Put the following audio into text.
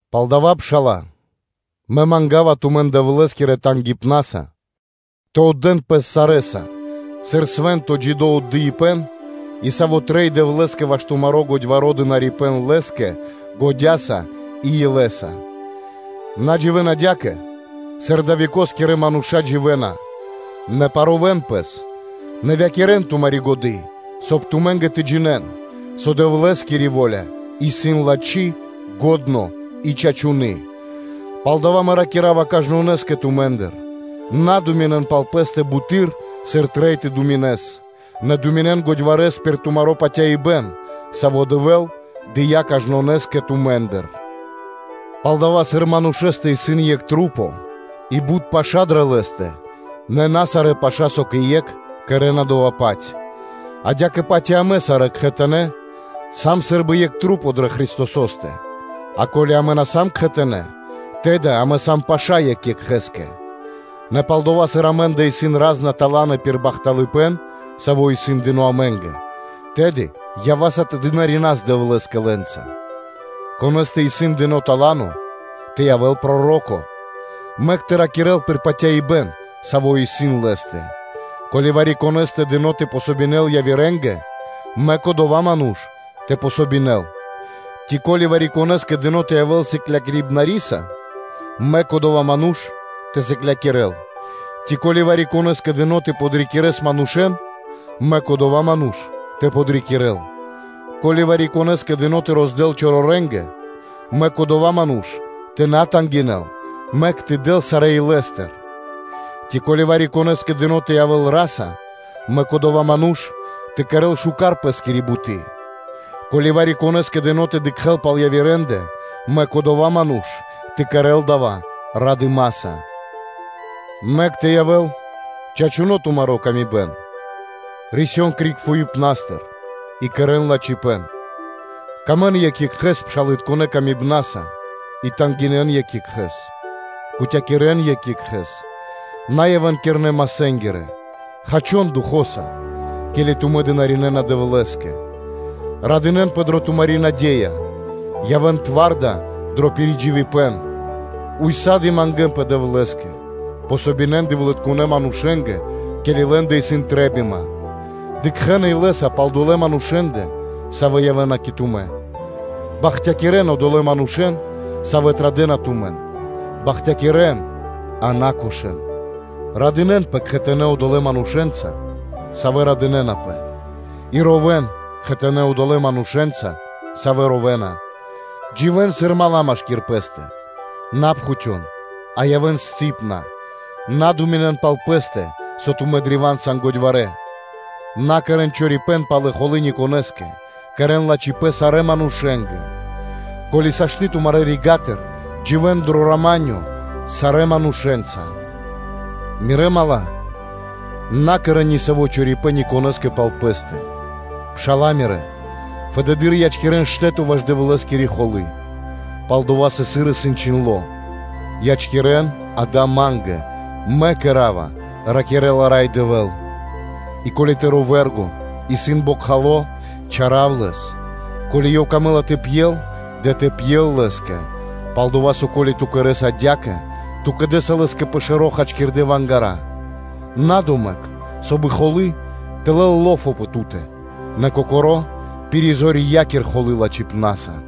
Палдава́, пшала́лэ, мэ манга́ва тумэн Дэвлэ́скирэ тангипнаса, тэ отдэ́н пэс сарэ́са сыр свэ́нто джидо́ отдыибэ́н и саво́ трэй Дэвлэ́скэ ваш тумаро́ годьваро́ дынарибэ́н (служэние) Лэ́скэ годя́са и илэ́са. На дживэ́н адя́кэ, сыр адалэ́-векоскирэ мануша́ дживэ́на, нэ парувэн пэс, нэвякирэн тумари́ годы́, соб (кай) тумэ́нгэ тэ джинэ́н, со Дэвлэ́скири во́ля исын лачхи́, бидошэнгири и чачуны́. Палдава́ мэ ракира́ва кажнонэ́скэ тумэ́ндыр: на думинэн пал пэ́стэ бутэды́р, сыр трэй тэ думинэс; нэ думинэн годьварэс пир тумаро́ патяибэ́н, саво́ Дэвэ́л дыя́ кажнонэ́скэ тумэ́ндыр. Палдава́, сыр манушэ́стэ исын екх маса́ и бут паша́ дрэ лэ́стэ, нэ на сарэ́ паша́, со кэ екх, кэрэ́на дова́-паць; адя́кэ-паць и амэ сарэ́ кхэтанэ́ сам сы́рбы екх маса́ дрэ Христосо́стэ, а ко́ли амэ на сам кхэтанэ́, тэды амэ сам паша́ екх екхэ́скэ. Нэ палдова́, сыр амэ́ндэ исын ра́зна таланы пир бахталыпэ́н, саво́ исын дыно́ амэ́нгэ, тэды ява́са тэ дынарина́с Дэвлэ́скэ лэ́нца, конэ́скэ исын дыно́ тала́но: тэ явэ́л проро́ко, мэк тэ ракирэ́л пир патяибэ́н, саво́ исын лэ́стэ: ко́ли вари-конэ́скэ дыно́ тэ помогинэл явирэ́нгэ, мэк одова́ ману́ш тэ помогинэл; ци, ко́ли вари-конэ́скэ дыно́ тэ явэ́л сыклякирибна́скиро, мэк одова́ ману́ш тэ сыклякирэ́л. Ци, ко́ли вари-конэ́скэ дыно́ тэ подрикирэ́л манушэ́н, мэк одова́ ману́ш тэ подрикирэ́л; ко́ли вари-конэ́скэ дыно́ тэ роздэл чорорэнгэ, мэк одова́ ману́ш тэ на тангинэ́л, мэк тэ дэл сарэ́ илэ́стыр; ци ко́ли вари-конэ́скэ дыно́ тэ явэ́л ра́са, мэк одова́ ману́ш тэ кэрэ́л миштэ́с пэ́скири буты́. Ко́ли вари-конэ́скэ дыно́ тэ дыкхэ́л пал явирэндэ, мэк одова́ ману́ш тэ кэрэ́л дава́ радыма́са. Мэк тэ явэ́л чачуны́ тумари́ пшалы́тко паты́в; рисён криг фуипнастыр и кэрэ́н лачхипэ́н: сыкавэ́н паты́в екх екхэ́скэ пшалытконэ патыва́са и тангинэн екх екхэ́с: кутякирэн (важынэн) екх екхэ́с; на явэ́н кирнэ́-масэ́нгирэ, хачон духо́са, ке́ли тумэ́ дынаринэна Дэвлэ́скэ. Радынэ́нпэ дро тумари́ наде́я: явэ́н зоралэ́ (тварда) дро пиридживипэн; ўса́ды (сак) мангэ́нпэ Дэвлэ́скэ; помогинэн (подэн васт) Дэвлытконэ́ манушэ́нгэ, ке́ли лэ́ндэ исын трэ́бима, дыкхэ́н илэ́са пал одолэ́ манушэ́ндэ, савэ́ явэ́на кэ тумэ́. Бахтякирэн одолэ́ манушэ́н, савэ́ традэ́на тумэн; бахтякирэн, а на кошэн. Радынэ́нпэ кхэтанэ́ одолэ́ манушэ́нца, савэ́ радынэ́напэ, и ровэ́н кхэтанэ́ одолэ́ манушэ́нца, савэ́ ровэна. Дживэ́н сыр мала́ (дру́ги) машки́р пэ́стэ; на пхутён, а явэ́н кандунэ; на думинэн пал пэ́стэ, со тумэ́ сан древа́н годьварэ́: на кэрэ́н чорипэ́н палэ пал холы́ никонэ́скэ, кэрэ́н лачхипэ́н сарэ́ манушэ́нгэ; ко́ли дава́ сашты́ тумарэ́ рига́тыр, дживэ́н дро рама́нё (миро) сарэ́ манушэ́нца. Мирэ́ мала́, на кэрэ́н нисаво́ чорипэ́н никонэ́скэ пал пэ́стэ, пша́ла мирэ́, фэды́р ячкирэн штэ́то ваш Дэвлэ́скири холы́; пал-дова́ со, сыр исын чхиндло́: “Ячкирэн дава́ Ма́нгэ, Мэ кэра́ва”, – ракирэ́ла Рай Дэвэ́л. И ко́ли тыро́ вэ́рго (врого) исын бокхало, чарав лэс; ко́ли ёв камэ́ла тэ пьел, дэ тэ пьел лэ́скэ; пал-дова́ со, ко́ли ту кэрэ́са адя́кэ, ту кэдэса лэ́скэ пэ шэро́ хачкирдэ́ вангара. На домэк, соб (кай) холы́ тэ лэл ло́фо (зор) пэ ту́тэ, нэ кокоро́ пиризорьякир холы́ лачхипна́са.